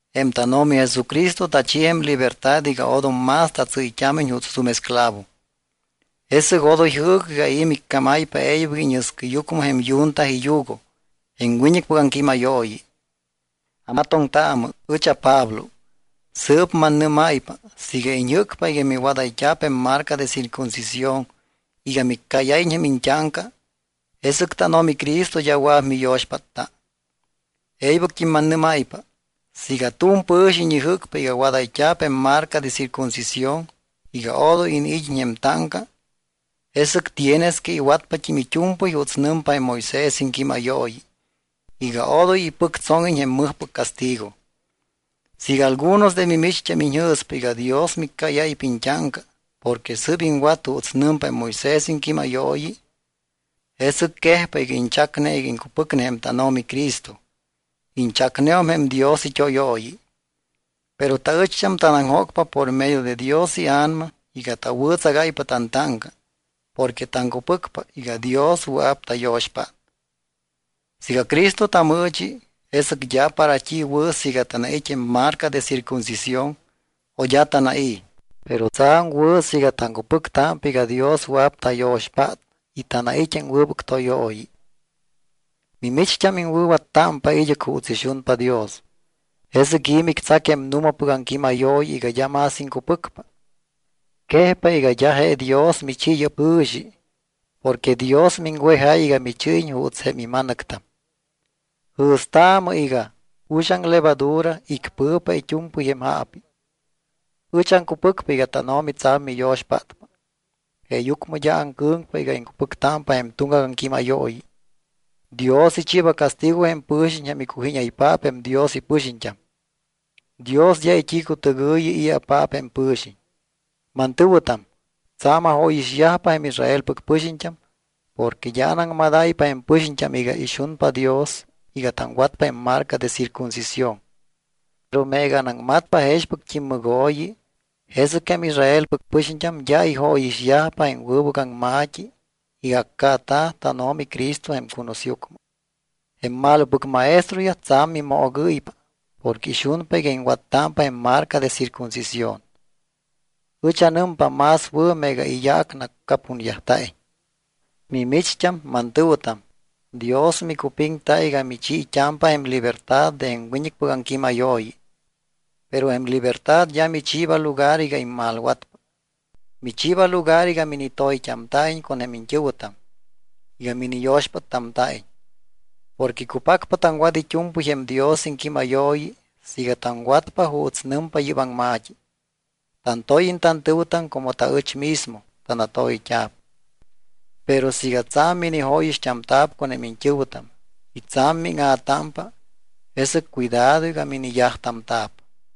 Jém tánO̱mi Jesucristo tachi jém libertad iga odom más tatsɨ́yt́ámiñ juuts tu̱m esclavo. Jesɨc odoy jɨɨcɨ iga i̱ miccámáypa e̱ybɨc íñɨscɨyucmɨ jém yunta iyugo, jém wiñɨcpɨc aŋquímayooyi. Amatoŋtaamɨ. Ɨch aPablo. Sɨɨp mannɨ́máypa siiga iñjɨ́cpa iga miwadayt́a̱p jém marca de circuncisión iga miccáyáyiñ jém iñt́áŋca, jesɨc tánO̱mi Cristo d́a wɨa̱p miyo̱xpátta. E̱ybɨct́im mannɨ́máypa, siiga tu̱m pɨ̱xiñ ijɨ́cpa iga wadayt́a̱p jém marca de circuncisión iga odoy iniid́iñ jém táŋca, jesɨc tienes que iwatpat́im it́u̱mpɨy juuts nɨmpa jém Moisés iŋquímayooyi iga odoy ipɨctsóŋiñ jém mɨjpɨc castigo. Siiga algunos de mimicht́am iñjɨ̱spa iga Dios miccáyáypa iñt́áŋca porque sɨ́p iŋwat juuts nɨmpa jém Moisés iŋquímayooyi, jesɨc quejpa iga iñchacne iga iŋcupɨcpa jém tánO̱mi Cristo. Iñchacneum jém Dios it́óyooyi. Pero taɨcht́am tanaŋjócpa por medio de Dios iA̱nama iga tawɨ̱tsagáypa tantáŋca porque taŋcupɨcpa iga Dios wɨa̱p tayo̱xpát. Siiga Cristo tamɨɨchi, jesɨc d́a para t́i wɨ̱ siiga tanait́ jém marca de circuncisión o d́a tanai̱. Pero tsa̱m wɨ̱ siiga taŋcupɨctámpa iga Dios wɨa̱p tayo̱xpát y tanait́ jém wɨbɨc tóyooyi. Mimicht́am iŋwɨ̱wattámpa id́ɨc juuts ixunpa Dios. ¿Jesɨc i̱ mictsac jém nu̱mapɨc aŋquímayooyi iga d́a más iŋcupɨcpa? Quejpa iga d́a je Dios michi yɨ́p jɨ̱xi porque Dios miŋwejáy iga michɨ́yiñ juuts jém ima̱nɨctam. Jɨ̱staamɨ iga: “Uxaŋ levadura icpɨ̱pa it́u̱mpɨy jém jaapi.” Ɨch aŋcupɨcpa iga tánO̱mi tsa̱m miyo̱xpátpa, jeeyucmɨ d́a aŋcɨ̱ŋpa iga iŋcupɨctámpa jém tuŋgac aŋquímayooyi. Dios ichiiba castigo jém pɨ̱xiñ jém icujíñaypaap jém Dios ipɨxiñt́am. Dios d́a it́i̱cutɨgɨ̱yi i̱apaap jém pɨ̱xiñ. Mantɨ̱wɨtam, tsa̱m ajóyixyajpa jém Israelpɨc pɨxiñt́am porque d́a anaŋmadáypa jém pɨxiñt́am iga ixunpa Dios iga taŋwatpa jém marca de circuncisión. Pero meega anaŋmatpa jexpɨct́im mɨgooyi, jesɨc jém Israelpɨc pɨxiñt́am d́a ijóyixyajpa jém wɨbɨc aŋma̱t́i iga accaata̱ tánO̱mi Cristo jém cunusyucmɨ. Jém malopɨc maestroyaj tsa̱m mimoogɨ́ypa porque ixunpa iga iŋwattámpa jém marca de circuncisión. Ɨch anɨmpa más wɨ̱ meega iyaac nacapunyajta̱iñ. Mimicht́am mantɨ̱wɨtam, Dios micupiŋta iga michiit́ámpa jém libertad de jém wiñɨcpɨc aŋquímayooyi. Pero jém libertad d́a michiiba lugar iga immalwatpa. Michiiba lugar iga minitoyt́amta̱iñ con jém iñt́ɨ̱wɨtam, iga miniyo̱xpáttamta̱iñ. Porque cupacpa taŋwat it́u̱mpɨy jém Dios iŋquímayooyi siiga taŋwatpa juuts nɨmpa yɨ́p aŋma̱t́i: “Tantóyiñ tantɨ̱wɨtam como taɨch mismo tanatoyt́a̱p.” Pero siiga tsa̱m minijóyixt́amta̱p con jém iñt́ɨ̱wɨtam y tsa̱m míŋa̱támpa, jesɨc cuidado iga miniyajtamta̱p.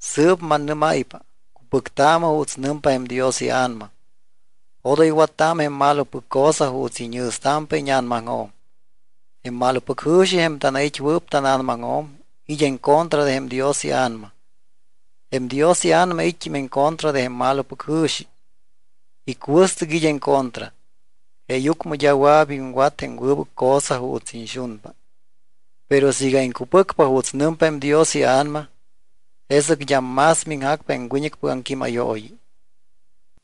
Sɨɨp mannɨ́máypa, cupɨctaamɨ juuts nɨmpa jém Dios iA̱nama, odoy wattaamɨ jém malopɨc cosa juuts iñjɨ̱stámpa íña̱namaŋjo̱m. Jém malopɨc jɨ̱xi, jém tanait́wɨɨp tána̱namaŋjo̱m, it́ en contra de jém Dios iA̱nama. Jém Dios iA̱nama it́t́im en contra de jém malopɨc jɨ̱xi. Icuɨstɨc it́ en contra. Jeeyucmɨ d́a wɨa̱p iŋwat jém wɨbɨc cosa juuts iñxunpa. Pero siiga iŋcupɨcpa juuts nɨmpa jém Dios iA̱nama, jesɨc d́am más miŋjacpa jém wiñɨcpɨc aŋquímayooyi.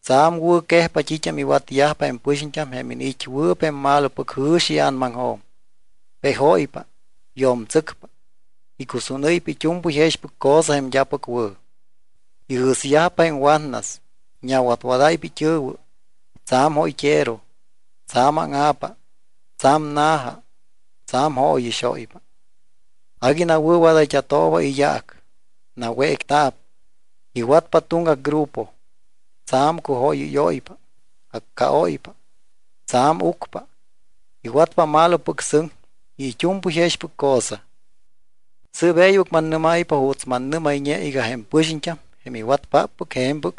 Tsa̱m wɨ̱quejpa t́it́am iwatyajpa jém pɨxiñt́am jém iniit́wɨɨp jém malopɨc jɨ̱xi ia̱namaŋjo̱m. Pejóypa, yo̱mtsɨcpa, icusúnɨ́ypa it́u̱mpɨy jexpɨc cosa jém d́apɨc wɨ̱. Ijɨ̱syajpa jém watnas, iñawatwadáypa it́ɨ̱wɨ. Tsa̱m jóyt́ero. Tsa̱m áŋa̱pa. Tsa̱m na̱ja. Tsa̱m jóyixóypa. Agui nawɨ̱wadayt́a̱tooba iyaac. Nawécta̱p, iwatpa tuŋgac grupo. Tsa̱m cujóyɨ́yóypa. Accaóypa. Tsa̱m ucpa. Iwatpa malopɨc sɨŋ y it́u̱mpɨy jexpɨc cosa. Sɨɨp e̱ybɨc mannɨ́máypa juuts mannɨ́mayñe iga jém pɨxiñt́am, jém iwatpáppɨc je̱mpɨc,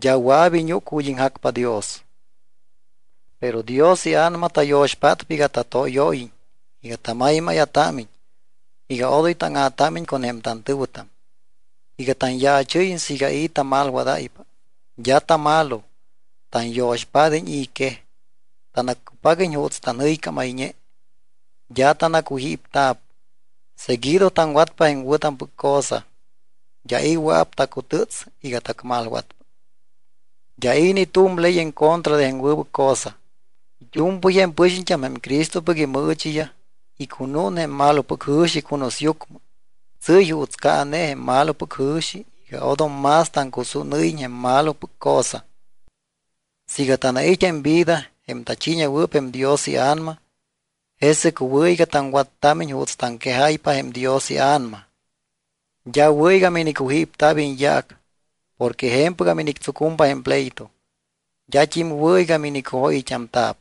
d́a wɨa̱p iñúc ju̱t́ iŋjacpa Dios. Pero Dios iA̱nama tayo̱xpátpa iga tatóyóyiñ, iga tamaymáya̱támiñ, iga odoy táŋa̱támiñ con jém tantɨ̱wɨtam, iga tanyaachɨ́yiñ siiga i̱ tamalwadáypa. D́a tamalo. Tanyo̱xpád́iñ i̱ quej, tanaccupaguiñ juuts tanjɨycámayñe. D́a tanacujípta̱p. Seguido taŋwatpa jém wɨ̱tampɨc cosa, d́a i̱ wɨa̱p tacutɨ́ts iga tacmalwatpa. D́a i̱ ni tu̱m ley en contra de jém wɨbɨc cosa. It́u̱mpɨy jém pɨxiñt́am jém Cristopɨc imɨɨchiyaj, icunún jém malopɨc ijɨ̱xi cunusyucmɨ. Tsɨ́y juuts caane jém malopɨc jɨ̱xi iga odom más taŋcusúnɨ́yiñ jém malopɨc cosa. Siiga tanait́ jém vida, jém tachiiñewɨɨp jém Dios iA̱nama, jesɨc wɨ̱ iga taŋwattámiñ juuts taŋquejáypa jém Dios iA̱nama. D́a wɨ̱ iga minicujípta̱p iñyaac porque je̱mpɨgam inictsucumpa jém pleito. D́at́im wɨ̱ iga minicujóyɨyt́amta̱p.